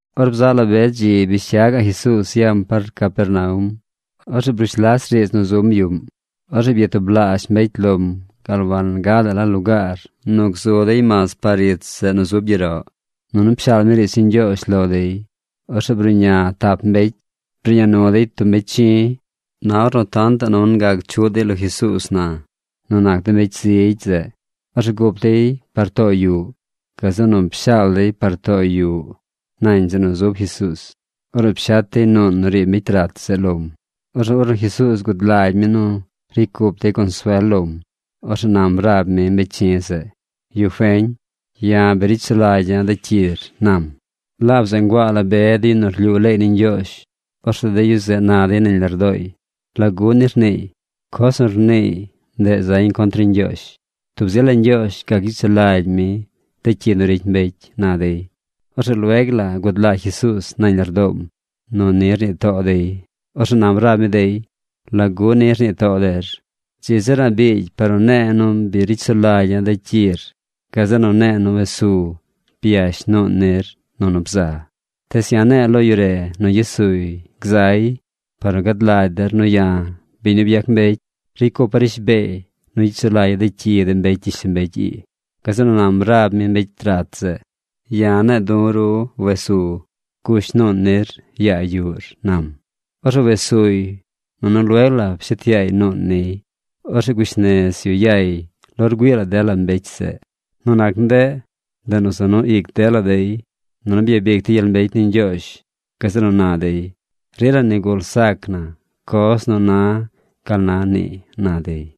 Or bzaꞌ la be dzi bish cya gaꞌ Jesuuz yam par Capernaum. Orzeꞌ brush las riidz nu zum yuꞌm. Orzeꞌ byatublaazh mbecy lom gal wagadaꞌ la lugaar nu gzu dey mas par ich zeꞌ nu zub gyeroꞌ. Nunu pshaal mi riidz ni Ñgyoozh lo dey. Orzeꞌ bruꞌña tap mbecy. Bruꞌña nu dey tub mbecy chi̱. Na ornu tantaꞌ nu wangac chuꞌ dey lo Jesuuz na nu nac de mbecy zigy zeꞌ, orzeꞌ gup dey par too yuꞌ. Gazeꞌ nu pshaal dey par too yuꞌ nañ zeꞌ nu zub Jesuuz. Orzeꞌ pshet dey nuun nu riib mbecy rat zeꞌ lom. Orzeꞌ ornu Jesuuz gud lagy mi nu ricy cup dey consuel lom, orzeꞌ nam rab mi mbecy chi̱ zeꞌ: ―Yu feñ, ya̱ bi ricy sulagya̱ de cyir ―nam. Laab zeꞌ nguaa la be de yu nu rlyuu leey ni Ñgyoozh. Orzeꞌ de yu zeꞌ na dey nañ lardooy: “¿Lagu ni rniiy? Coz nu rniiy, ndeꞌ zañ contr ni Ñgyoozh. Tub zi la Ñgyoozh gac gyicy sulagy mi de cyi nu ricy mbecy”, na dey. Orzeꞌ lueg la gud lagy Jesuuz nañ lardoom nu ni rnii too dey. Orzeꞌ nam rab mi dey: ―¿Lagu ni rnii too der? Dzi zir a̱ꞌ biigy par nu ne̱e̱ nu bi ricy sulagya̱ de cyir gazeꞌ nu ne̱e̱ nu wes zu, byash nuun nir nunu bza. Tees ya̱ ne̱e̱ lo yu re nu gyes suy gzay par nu gad lagy der nu ya̱, biñ nu byac mbecy, ricy cupa̱ rishbeey nu gyicy sulagya̱ de cyi de mbecy gyishlombecy ii. Gazeꞌ nu nam rab mi mbecy rat zeꞌ: ―Ya̱ ne̱e̱ du̱ ru wes su, gush nuun nir, yaa yuꞌr ―nam. Orzeꞌ wes suy, nunu lueg la pshet yaay nuun niy. Orzeꞌ gush nez yu yay lo rgüii la dela mbecy zeꞌ. Nu nac ndeꞌ, ndeꞌ nu za nu ic dela dey nunu byabic dey gyel mbecy ni Ñgyoozh. Gazeꞌ nu na dey: ―Rila nigul zac na coz nu na gal na nii ―na dey.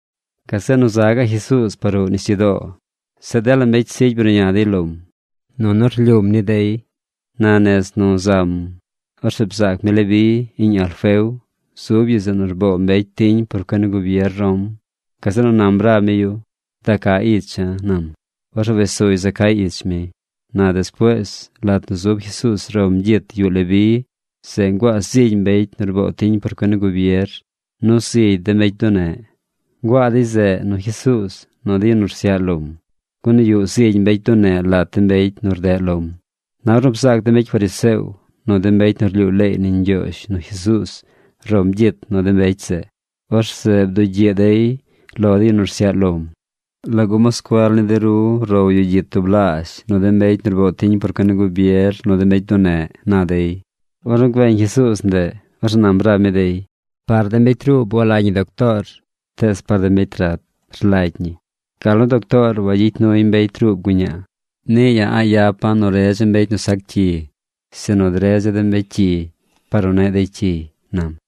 Gazeꞌ nu za gaꞌ Jesuuz par ruꞌ nisyudoo. Zeꞌ dela mbecy zigy bruꞌña dey lom, nunu rlyuum ni dey. Na nez nu zam, orzeꞌ bzaac mi Leví, iꞌñ Alfeo. Zub yu zeꞌ nu rboo mbecy tiñ por cuen ni gubier Rom. Gazeꞌ nu nam rab mi yu: ―Da ca icha̱ ―nam. Orzeꞌ wes suy za cay ich mi. Na despuees, lat nu zub Jesuuz rom gyit yuꞌ Leví, zeꞌ nguaa zigy mbecy nu rboo tiñ por cuen ni gubier, nu zigy de mbecy bduneꞌ. Nguaa dey zeꞌ nu Jesuuz nu de yu nu rsyaꞌ lom, gun yuꞌ zigy mbecy bduneꞌ lat de mbecy nu rdeꞌ lom. Na ornu bzaac de mbecy fariseo nu de mbecy nu rlyuu leey ni Ñgyoozh nu Jesuuz rom gyit nu de mbecy zeꞌ, orzeꞌ bdugyiꞌ dey lo de yu nu rsyaꞌ lom: ―¿Lagu moscuel ni de ru row yu gyit tublaazh nu de mbecy nu rboo tiñ por cuen ni gubier nu de mbecy bduneꞌ? ―na dey. Ornu güeñ Jesuuz ndeꞌ, orzeꞌ nam rab mi dey: ―Par de mbecy ruub walagy ñi doctoor, tees par de mbecy rat rlagy ñi. Gal nu doctoor wagyicy nuy mbecy ruub guñaa, niꞌ ya̱ a̱ꞌ yapa̱ nu redza̱ mbecy nu sac cyi, sinu dredza̱ de mbecy cyi par nu neꞌ dey cyiy ―nam.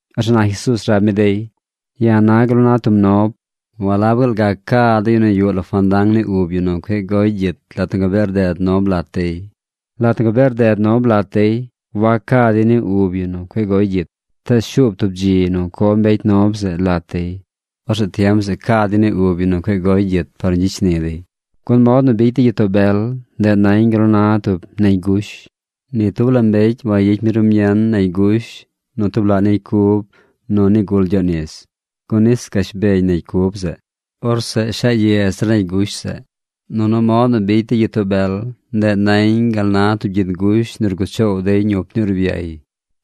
Orzeꞌ na Jesuuz rab mi dey: ―Ya̱ na gal nu na tub nob. ¿Walab gaal gac ca de yu nu yuꞌ lo fandang ni ub yu nu cueꞌ goy gyit lat nu gabee rded nob lat dey? Lat nu gabee rded nob lat dey, wac ca dey ni ub yu nu cueꞌ goy gyit. Tees shuub tub dzi nu co mbecy nob zeꞌ lat dey. Orzeꞌ tiem zeꞌ ca dey ni ub yu nu cueꞌ goy gyit par nu gyicy shni dey. ’Gun mod nu bicy de gyitoo bel, ndeꞌ nañ gal nu na tub negy gush. Ni tub la mbecy wayicy mi rumien negy gush nu tub laꞌ negy cub nu nigul gyoꞌ nis, gun nis gash beñ negy cub zeꞌ. Orzeꞌ shaa ye zir negy gush zeꞌ. Nunu mod nu bicy de gyitoo bel, ndeꞌ nañ gal na tub gyid gush nu rguꞌ choow dey ñup ni urbyay.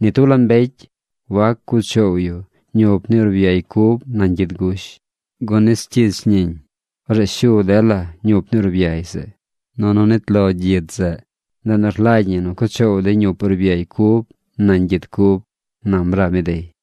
Ni tub la mbecy wac cuꞌ choow yu ñup ni urbyay cub nañ gyid gush, gun nis cyich ñiñ. Orzeꞌ shu dela ñup ni urbyay zeꞌ, nunu nit lo gyid zeꞌ. Ndeꞌ nu rlagy ñi cuꞌ choow dey ñup urbyay cub nañ gyid cub ―nam rab mi dey.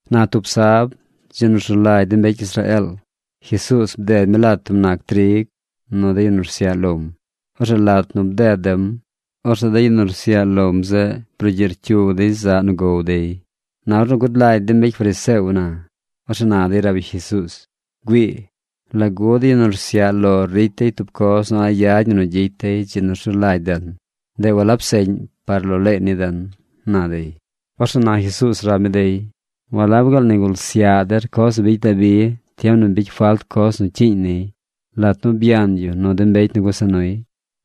Na tub sab, dzi nu rzu lagy de mbecy Israeel, Jesuuz bded mi lat tub nac trig nu de yu nu rsyaꞌ lom. Orzeꞌ lat nu bded dem, orzeꞌ de yu nu rsyaꞌ lom zeꞌ brugyiꞌ rcyug dey zaꞌ nu gow dey. Na ornu gud lagy de mbecy fariseo na, orzeꞌ na dey rab yu Jesuuz: ―Güii, ¿lagu de yu nu rsyaꞌ lor ricy dey tub coz nu a̱ꞌ yad ñi nu gyicy dey dzi nu rzu lagy den? Ndeꞌ walab seꞌñ par lo leey ni den―na dey. Orzeꞌ na Jesuuz rab mi dey: ―¿Walab gaal nigul syaꞌ der coz nu bicy Dabi tiem nu bicy falt coz nu cyiiñ niy lat nu byan yu nu de mbecy nu gusa nuy?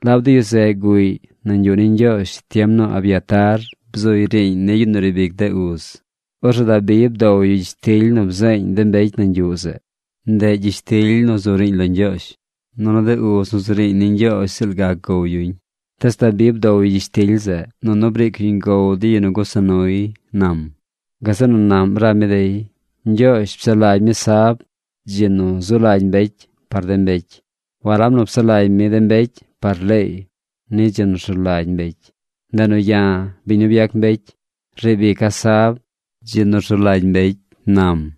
Laab de yu zeꞌ guꞌy nañ yuꞌ ni Ñgyoozh tiem nu Abiatar bzuy riiñ ni yu nu riib ic de uz. Orzeꞌ Dabi bdow yu gyishtily nu bzeeñ de mbecy nañ yuꞌ zeꞌ. Ndeꞌ gyishtily nu zu riiñ lo Ñgyoozh. Nunu de uz nu zu riiñ ni Ñgyoozh ziꞌl gac gow yuñ. Tees Dabi bdow yu gyishtily zeꞌ, nunu briic yuñ gow de yu nu gusa nuy ―nam. Gazeꞌ nu naꞌm rab mi dey: ―Ñgyoozh psaꞌ lagy mi sab, dzi nu zu lagy mbecy par de mbecy. Walab nu psaꞌ lagy mi de mbecy par leey ni dzi nu rzu lagy mbecy. Ndeꞌ nu ya̱, biñ nu byac mbecy, riib ica̱ sab, dzi nu rzu lagy mbecy ―nam.